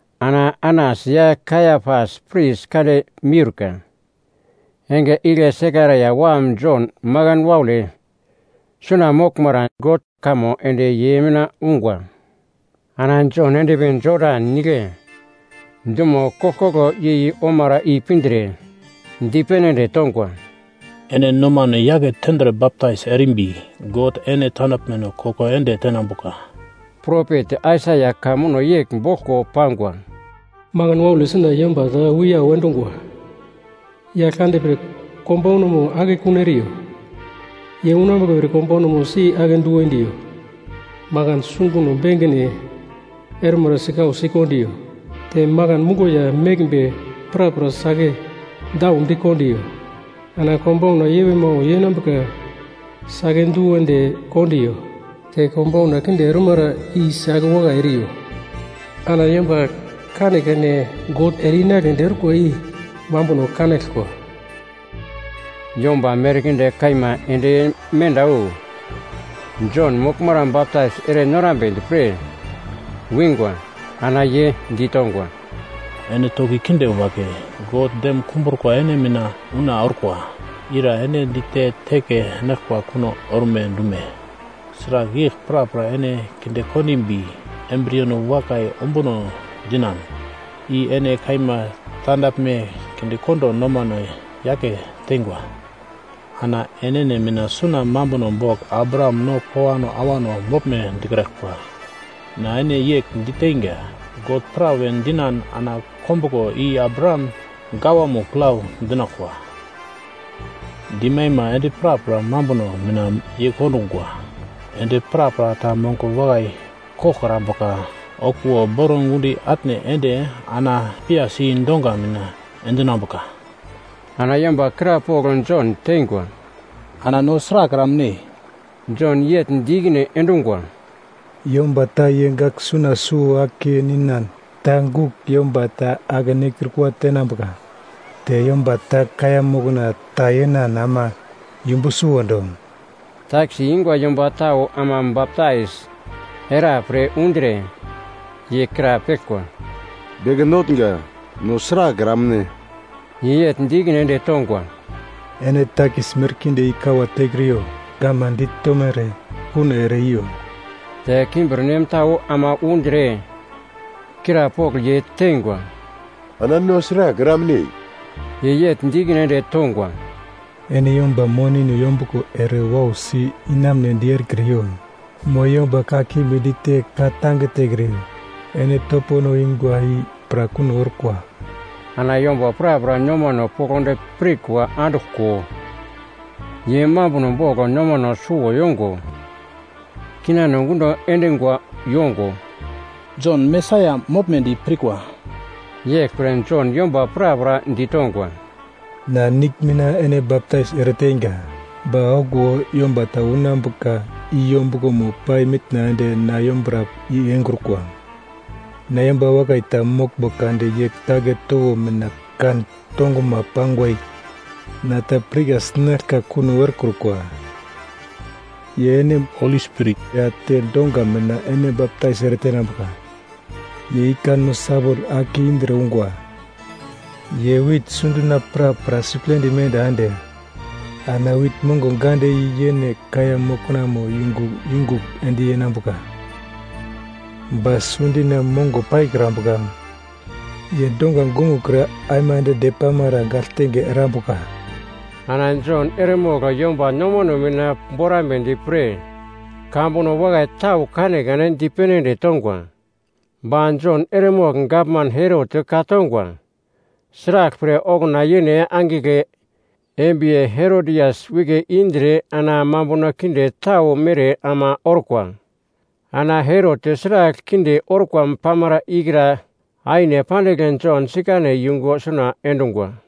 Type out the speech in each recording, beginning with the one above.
Ana Anas ya Kaiapas pris kande miurka, enge igle Sekaraia wam Jon makan waule suna moglmara God kamo ende ye mina ungwa. Ana Jon endpi Jodan Nigle dumo koglkoglo yei omara i pindre dipene ende tongwa, “Ene nomano yake tendre baptais erimbi, God ene tandaglmeno koko ende tenambuka.” Propet Aisaia ka muno yegl boglko pangwa: “Makan waule suna yomba ta wiyau endungwa, ‘Yaglkande pre konbaunamo akekun eriyo. Ye unambuka pre konbo si-ake du endiyo. Makan sunguno bengine ormara sikausi kondiyo, te makan muglo ya meglmbe prapra si-ake daudi kondiyo. Ana konbauna yewe-mawe yenambuka si-ake du ende kondiyo. Te konbauna kinde ormara i si-ake wakai eriyo. Ana yomba kanekane God ere-inagledi orkwa i mambuno kanaglkwa.’” Yomba merkinde kaima ende menda wu Jon moglmara baptais ere norambedi pre wingwa. Ana ye ditongwa, “Ene toki kinde wagle, God dem kumbrukwa ene mina una orkwa. Ira ene dite teke enaglkwa kuno orme dume? Sragl yegl prapra ene kinde kondimbi, embriyeno wakai ombuno dinan, i ene kaima tandaglme kindekondo nomano yake teingwa. Ana enene mina suna mambuno bogl Abraham no kowano awano moglme dikraglkwa. Na ene yegl diteinga, God pra we dinan ana kombuglo i Abraham gawamo plau dinaglkwa. Dimaima endi prapra mambuno mina yeikondungwa. Ende prapra ta mongo wakai koglkrambuka okuwo boro gundi atne ende ana piyasi donga mina endinambuka.” Ana yomba krapogl Jon teingwa, “Ana no sragl eramne?” Jon yegl di ikine endungwa, “Yomba ta ye gaglsuna suwo ake ninan ta gugl yomba ta ake-nekrukwa tenambuka, te yomba ta kaiya mokna ta yenan ama yumbu suwondo.” Takis ingwa yomba tau ama baptais era pre undre, ye krapeglkwa, “Beke Notnga, no sragl eramne?” Ye yegl di ikine ende tongwa, “Ene takis merkinde i kawa tekriyo, gavman ditomere kuno ere i yo.” Te kimbirnem tau ama undre krapogl ye teingwa, “Ana no sragl eramne?” Ye yegl di ikine ende tongwa, “Ene yomba monino yombuglo ere wausi inamunedi erekriyo, mo yomba kakimbi dite ka-tange tekriyo. Ene topono ingwa i pra kuno orkwa.” Ana yomba prapra nomano poglodi pirkwa anduglko, ye mambuno bogl nomano suwo yongo, kinano gundo endingwa yongo, “Jon Mesaia moglmedi pirkwa.” Yeglpre Jon yomba prapra ditongwa, “Na nigl mina ene baptais ereteinga. Ba okuwo yomba ta unambuka i yombuglomo pai mitna ende na yombura i engrukwa. Na yomba wakai ta moglmbo kade ye kagle towo mina kan tonguma pangwa i na ta pirka sinaglka kuno erekrukwa. Ye ene Holi Spirit ya te donga mina ene baptais ere tenambuka. Ye ikanmo sawol ake indre ungwa. Ye wit sundina prapra siplendi menda ende ana wit mongo gande i yene kaiya moknamo yungu yungugl endinambuka. Ba sundina mongo paikrambuka ye donga gongokre aimande depamara gagltenge erambuka.” Ana Jon eremogl yomba nomano mina borambedi pre kamambuno wakai tau kanekane dipene ende tongwa. Ba Jon eremogl gavman Herot ka-tongwa, sraglpre okuna yene angigle embiye Herodias wike indre ana mambuno kinde tau mere ama orkwa. Ana Herot sragl kinde orkwa pamara ikra aine pandigl Jon sikane yungu suna endungwa.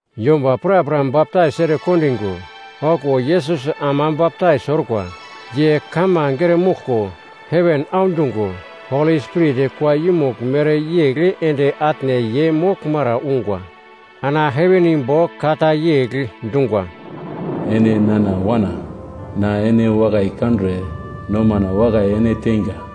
Yomba prapra baptais ere kondingo, okuwo Yesus ama baptais orkwa. Ye kamange ere moglko, heven audungo, Holi Spirit kua yumugl mereyegl ende atne ye moglmara ungwa. Ana heven imbo ka ta yegl dungwa, “Ene nana Wana, na ene wakai kandre nomana wakai ene teinga.”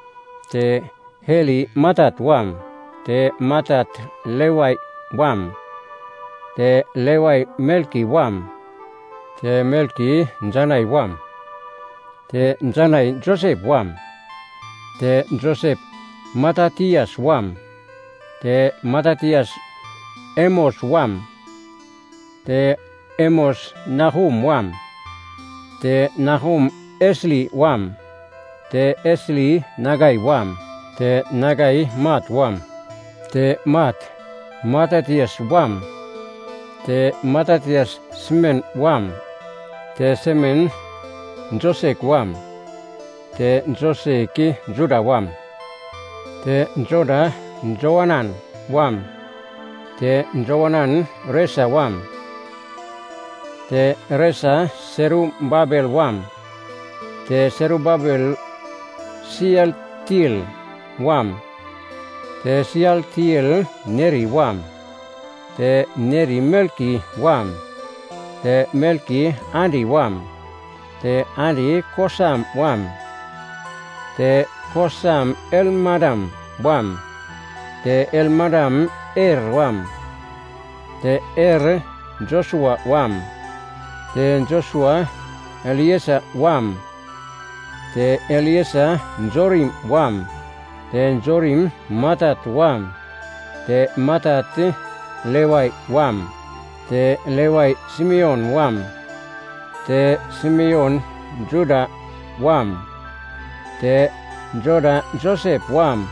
te Heli Matat wam, te Matat Levai wam, te Levai Melki wam, te Melki Janai wam, te Janai Josep wam, te Josep Matatias wam, te Matatias Amos wam, te Amos Nahum wam, te Nahum Esli wam, te Esli Nagai wam, te Nagai Mat wam, te Mat Matatias wam, te Matatias Semen wam, te Semen Josek wam, te Josek Joda wam, te Joda Joanan wam, te Joanan Resa wam, te Resa Serubabel wam, te Serubabel Sialtiel wam, te Sialtiel Neri wam, te Neri Melki wam, te Melki Adi wam, te Adi Kosam wam, te Kosam Elmadam wam, te Elmadam Er wam, te Er Josua wam, te Josua Eliser wam, te Eliser Jorim wam, te Jorim Matat wam, te Matat Levai wam, te Levai Simeon wam, te Simeon Juda wam, te Juda Josep wam,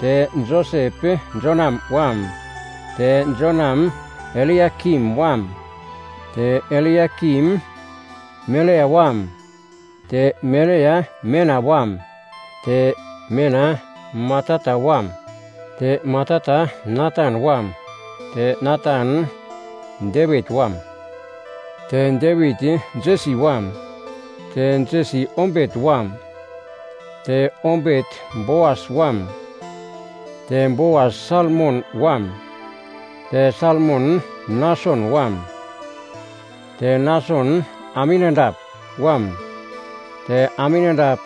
te Josep Jonam wam, te Jonam Eliakim wam, te Eliakim Melea wam, te Melea Mena wam, te Mena Matata wam, te Matata Natan wam, te Natan Devit wam, te Devit Jesi wam, te Jesi Obet wam, te Obet Boas wam, te Boas Salmon wam, te Salmon Nason wam, te Nason Aminadap wam, te Aminadap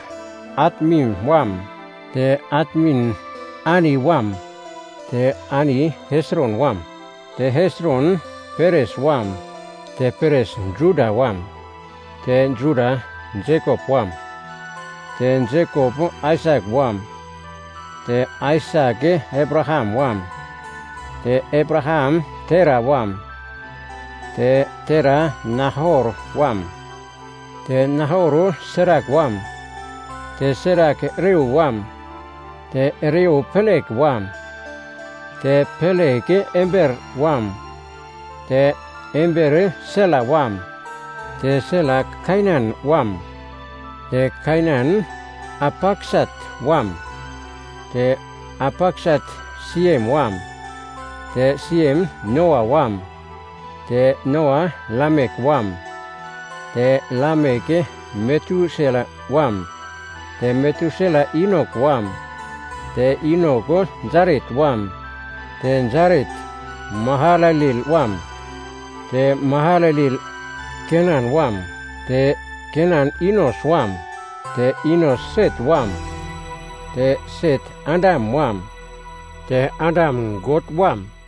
Atmin wam, te Atmin Arni wam, te Arni Hesron wam, te Hesron Peres wam, te Peres Juda wam, te Juda Jekop wam, te Jekop Aisak wam, te Aisak Abraham wam, te Abraham Tera wam, te Tera Nahor wam, te Nahor Serak wam, te Serak Reu wam, te Reu Pelek wam, te Pelek Eber wam, te Eber Sela wam, te Sela Kainan wam, te Kainan Arpaksat wam, te Arpaksat Siem wam, te Siem Noa wam, te Noa Lamek wam, te Lamek Metusela wam, te Metusela Inok wam, te Inok Jaret wam, te Jaret Mahalalel wam, te Mahalalel Kenan wam, te Kenan Inos wam, te Inos Set wam, te Set Adam wam, te Adam God wam.